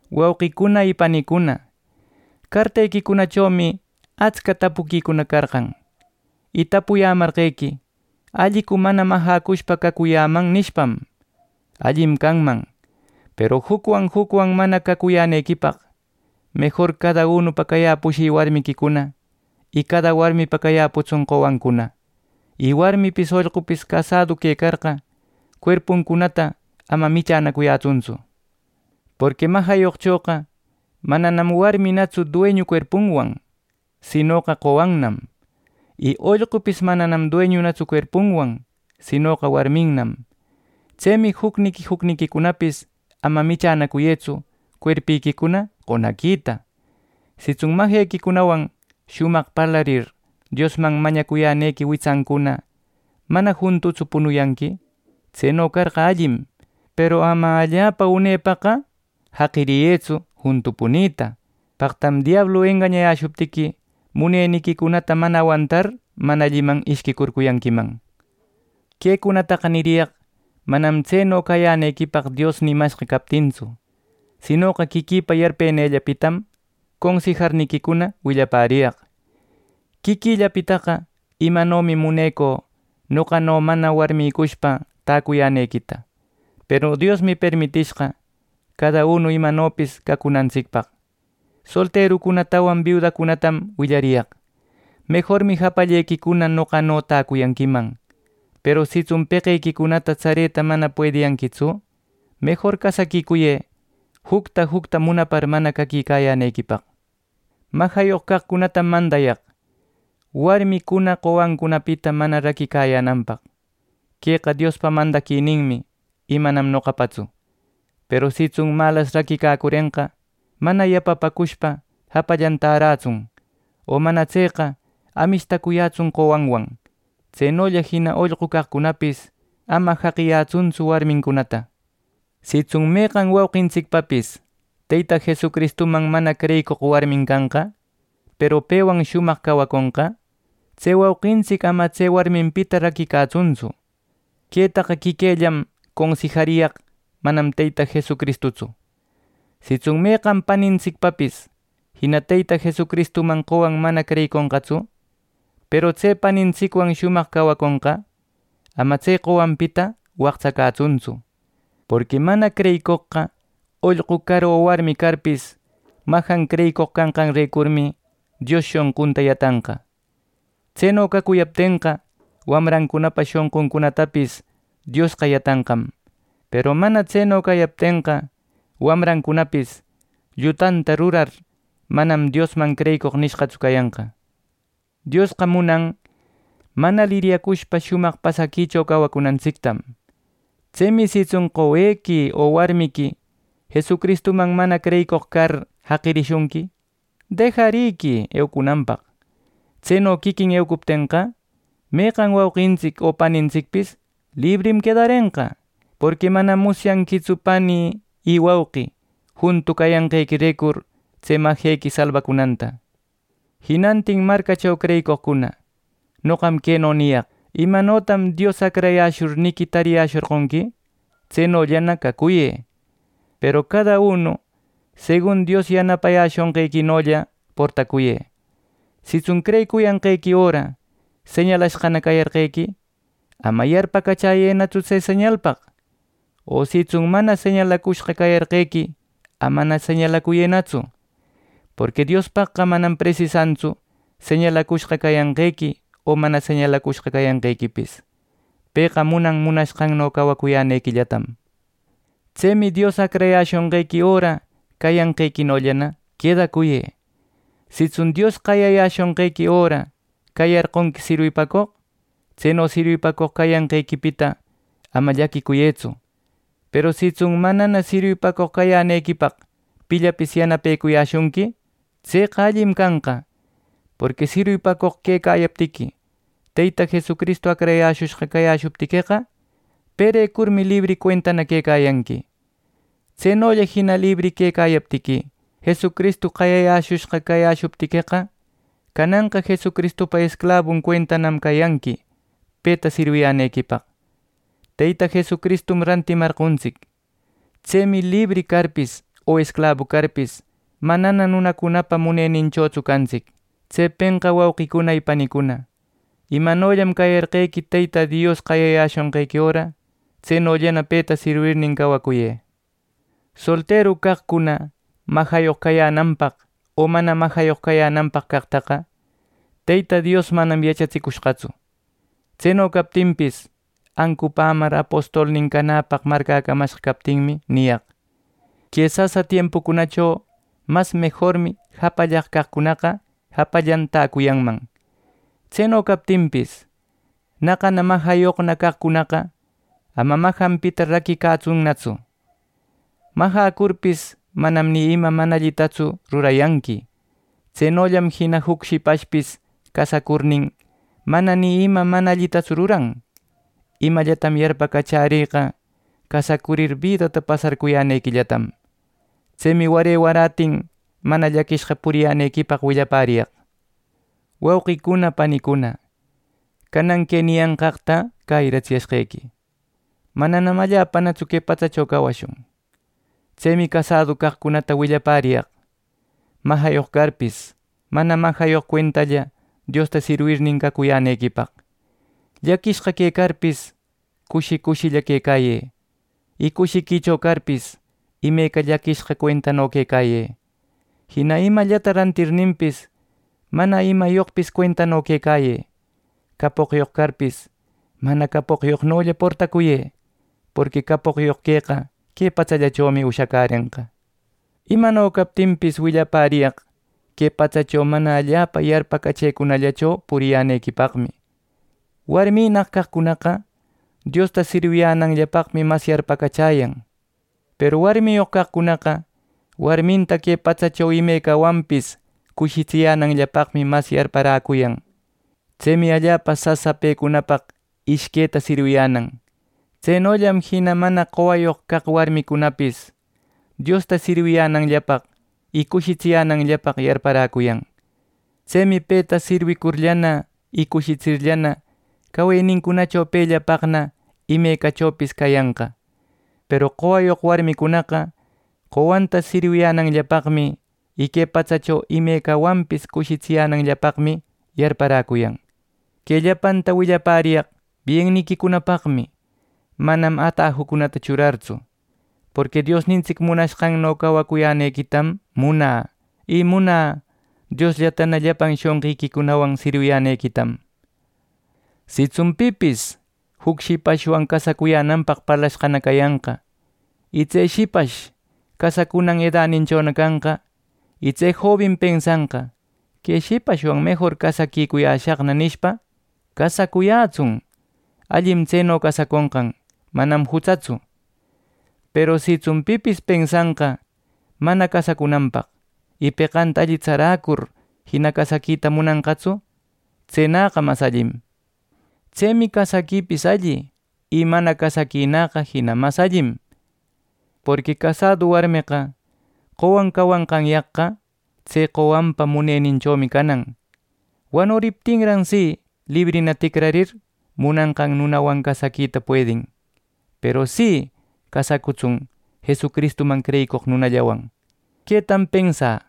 Wauqicuna y panicuna, cartequicunachomi atsca tapuquicuna carqan. Y tapuyämarquequi “¿Allicu mana majäcushpa cacuyäman?” nishpam. Allim canman, peru jucwan jucwan mana cacuyänequipaq, mejor cada unupa cayäpushï warmiquicuna, y cada warmipa cayäputsun qowancuna. Y warmipis ollqupis casadu quecarqa cuerpuncunata ama michänacuyätsuntsu. Porqui majayoqchoqa mananam warminatsu dueñu cuerpunwan; sinoqa qowannam y ollqupis mananam dueñunatsu cuerpunwan; sinoqa warminnam. Tsemi jucniqui jucniquicunapis ama michänacuyëtsu cuerpiquicuna qonaquita. Sitsun majequicunawan shumaq parlarir, Diosman mañacuyänequi witsancuna mana juntutsu punuyanqui; tseno carqa allim, peru ama allapa unepaqa jaqiriyëtsu juntu punita, paqtam diablu engañecuyäshuptiqui muneniquicunata mana awantar mana alliman ishquicurcuyanquiman. Quecunataqa niriyaq manam tseno cayänequipaq Dios nimashqa captintsu, sinoqa quiquïpa yarpenïllapitam consijarniquicuna willapäriyaq. Quiquïllapitaqa imanomi munecü noqano mana warmïcushpa tacuyänequita; peru Diosmi permitishqa cada uno imanopis cacunantsicpaq. Solterucunatawan biudacunatam willariyaq: Mejormi japallequicuna noqano täcuyanquiman; peru sitsun peqequicunata tsareta mana puediyanquitsu, mejor casaquicuyë jucta jucta munapar mana caquicayänequipaq. Majayoq caqcunatam mandayaq, warmicuna qowancunapita mana raquicayänanpaq. Queqa Diospa mandaquininmi y manam noqapatsu. Peru sitsun malas raquicacurenqa, mana yapapäcushpa japallan tärätsun o mana tseqa amishtacuyätsun qowanwan. Tsenolla jina ollqu caqcunapis ama jaqiyätsuntsu warmincunata. Sitsun meqan wauqintsicpapis Teyta Jesucristuman mana creyicoq warmin canqa, peru pewan shumaq cawaconqa, tse wauqintsic ama tse warminpita raquicatsuntsu. Quetaqa quiquïllan consijariyaq manam Teyta Jesucristutsu. Sitsun meqan panintsicpapis jina Teyta Jesucristuman qowan mana creyiconqatsu, peru tse panintsicwan shumaq cawaconqa, ama tse qowanpita waqtsacätsuntsu. Porqui mana creyicoqqa ollqu car o warmi carpis majan creyicoq canqanrecurmi Dios shonqunta yatanqa. Tseno cacuyaptenqa, wamrancunapa shonquncunatapis Diosqa yatanqam; peru mana tseno cayaptenqa, wamrancunapis llutanta rurar manam Diosman creyicoq nishqatsu cayanqa. Diosqa munan mana liryacushpa shumaq pasaquicho cawacunantsictam. Tsemi sitsun qowequi o warmiqui Jesucristuman mana creyicoq car jaqirishunqui, dejarïquï eucunanpaq. Tseno quiquin eucuptenqa, meqan wauqintsic o panintsicpis librim quedarenqa. Porqui manam musyanquitsu pani y wauqi juntu cayanqequirecur, tse majequi salbacunanta. Jinantin marcacho creyicoqcuna, noqam queno niyaq: Imanotam Dios acrayäshurniqui tarishorqonqui tsenollana cacuyë, peru cada uno segun Dios yanapayäshonqequinolla portacuyë. Sitsun creyicuyanqequi öra señalashqana cayarqequi, ama yarpacachäyëtsu tse señalpaq. O sitsun mana señalacushqa cayarqequi amana señalacuyënatsu. Porqui Diospaqqa manam presisantsu señalacushqa cayanqequi o mana señalacushqa cayanqequipis. Pëqa munan munashqanno cawacuyänequillatam. Tsemi Dios acrayäshonqequi öra cayanqequinollana quedacuyë. Sitsun Dios qayayäshonqequi öra cayarqonqui sirwipacoq, tseno sirwipacoq cayanqequipita ama llaquicuyëtsu; peru sitsun manana sirwipacoq cayänequipaq pillapis yanapecuyäshunqui, tseqa allim canqa. Porqui sirwipacoq quecayaptiqui, Teyta Jesucristu acrayäshushqa cayäshuptiqueqa, perecurmi libri cuenta quecayanqui. Tsenolla jina libri quecayaptiqui, Jesucristu qayayäshushqa cayäshuptiqueqa, cananqa Jesucristupa esclabun cuentanam cayanqui peta sirwiyänequipaq. Teyta Jesucristum rantimarqontsic. Tsemi libri carpis o esclabu carpis, manana nunacunapa muneninchotsu cantsic. Tsepenqa, wauqicuna y panicuna, imanollam cayarqequi Teyta Dios qayayäshonqequi öra, tsenollana peta sirwirnin cawacuyë. Solteru caqcuna majayoq cayänanpaq o mana majayoq cayänanpaq caqtaqa Teyta Dios manam yachatsicushqatsu. Tseno captinpis, ancupämar apostolnin canäpaq marcäcamashqa captinmi niyaq: Que sasa tiempucunacho mas mejormi japallaq caqcunaqa japallan täcuyanman. Tseno captinpis, naqana majayoqna caqcunaqa ama majanpita raquicatsunnatsu. Majäcurpis, manam ni ima mana allitatsu rurayanqui. Tsenollam jina juc shipashpis casacurnin, mana ni ima mana allitatsu ruran. Imallatam yarpacachärïqa, casacurir bidata pasarcuyänequillatam. Tsemi ware warätin mana llaquishqa puriyänequipaq willapäriyaq. Wauqicuna panicuna, canan que niyanqaqta cäyiratsiyashqequi: Mananam allapanatsu que patsacho cawashun. Tsemi casadu caqcunata willapäriyaq: majayoq carpis, mana majayoq cuentalla Diosta sirwirnin cawacuyänequipaq. Llaquishqa quecarpis, cushi cushilla quecayë; y cushiquicho carpis, imeca llaquishqa cuentano quecayë. Jina imallata rantirninpis, mana imayoqpis cuentano quecayë. Capoqyoq carpis, mana capoqyoqnolla portacuyë. Porqui capoqyoq queqa que patsallachomi ushacärenqa. Imano captinpis, willapäriyaq que patsacho mana allapa yarpacachëcunallacho puriyänequipaqmi: Warminnaq caqcunaqa Diosta sirwiyänanllapaqmi mas yarpacachäyan. Peru warmiyoq caqcunaqa warminta que patsacho imecawanpis cushitsiyänanllapaqmi mas yarparäcuyan. Tsemi allapa sasa pecunapaq ishqueta sirwiyänan. Tsenollam jina mana qowayoq caq warmicunapis Diosta sirwiyänanllapaq y cushitsiyänanllapaq yarparäcuyan. Tsemi peta sirwicurllana y cushitsirllana, cawenincunacho pellapaqna imecachopis cayanqa. Peru qowayoq warmicunaqa qowanta sirwiyänanllapaqmi y que patsacho imecawanpis cushitsiyänanllapaqmi yarparäcuyan. Que llapanta willapäriyaq bienniquicunapaqmi manam atajucunata churartsu. Porqui Diosnintsic munashqanno cawacuyänequitam munä; y munä Diosllatana llapan shonqiquicunawan sirwiyänequitam. Sitsun pipis juc shipashwan casacuyänanpaq parlashqana cayanqa, y tse shipash casacunan edaninchona canqa, y tse jobin pensanqa “Que shipashwan mejor casaquicuyäshaqna” nishpa, casacuyätsun. Allim tseno casaconqan, manam jutsatsu. Peru sitsun pipis pensanqa mana casacunanpaq, y peqanta alli tsaräcur jina casaquita munanqatsu, tsenäqa mas allim. Tsemi casaquipis alli y mana casaquinaqa jina mas allim. Porqui casadu warmeqa qowan cawanqanyaqqa, tse qowanpa muneninchomi canan; wanuriptinnam si, librina ticrarir munanqan nunawan casaquita puedin; peru si, casacutsun Jesucristuman creyicoq nunallawan. Quetam pensä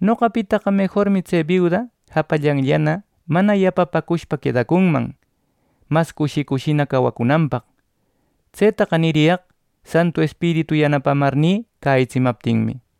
noqapitaqa mejormi tse biuda japallanllana manana yapapäcushpa quedacunman, mas cushi cushina cawacunanpaq. Tsetaqa niriyaq Santu Espiritu yanapamarnï cäyïtsimaptinmi.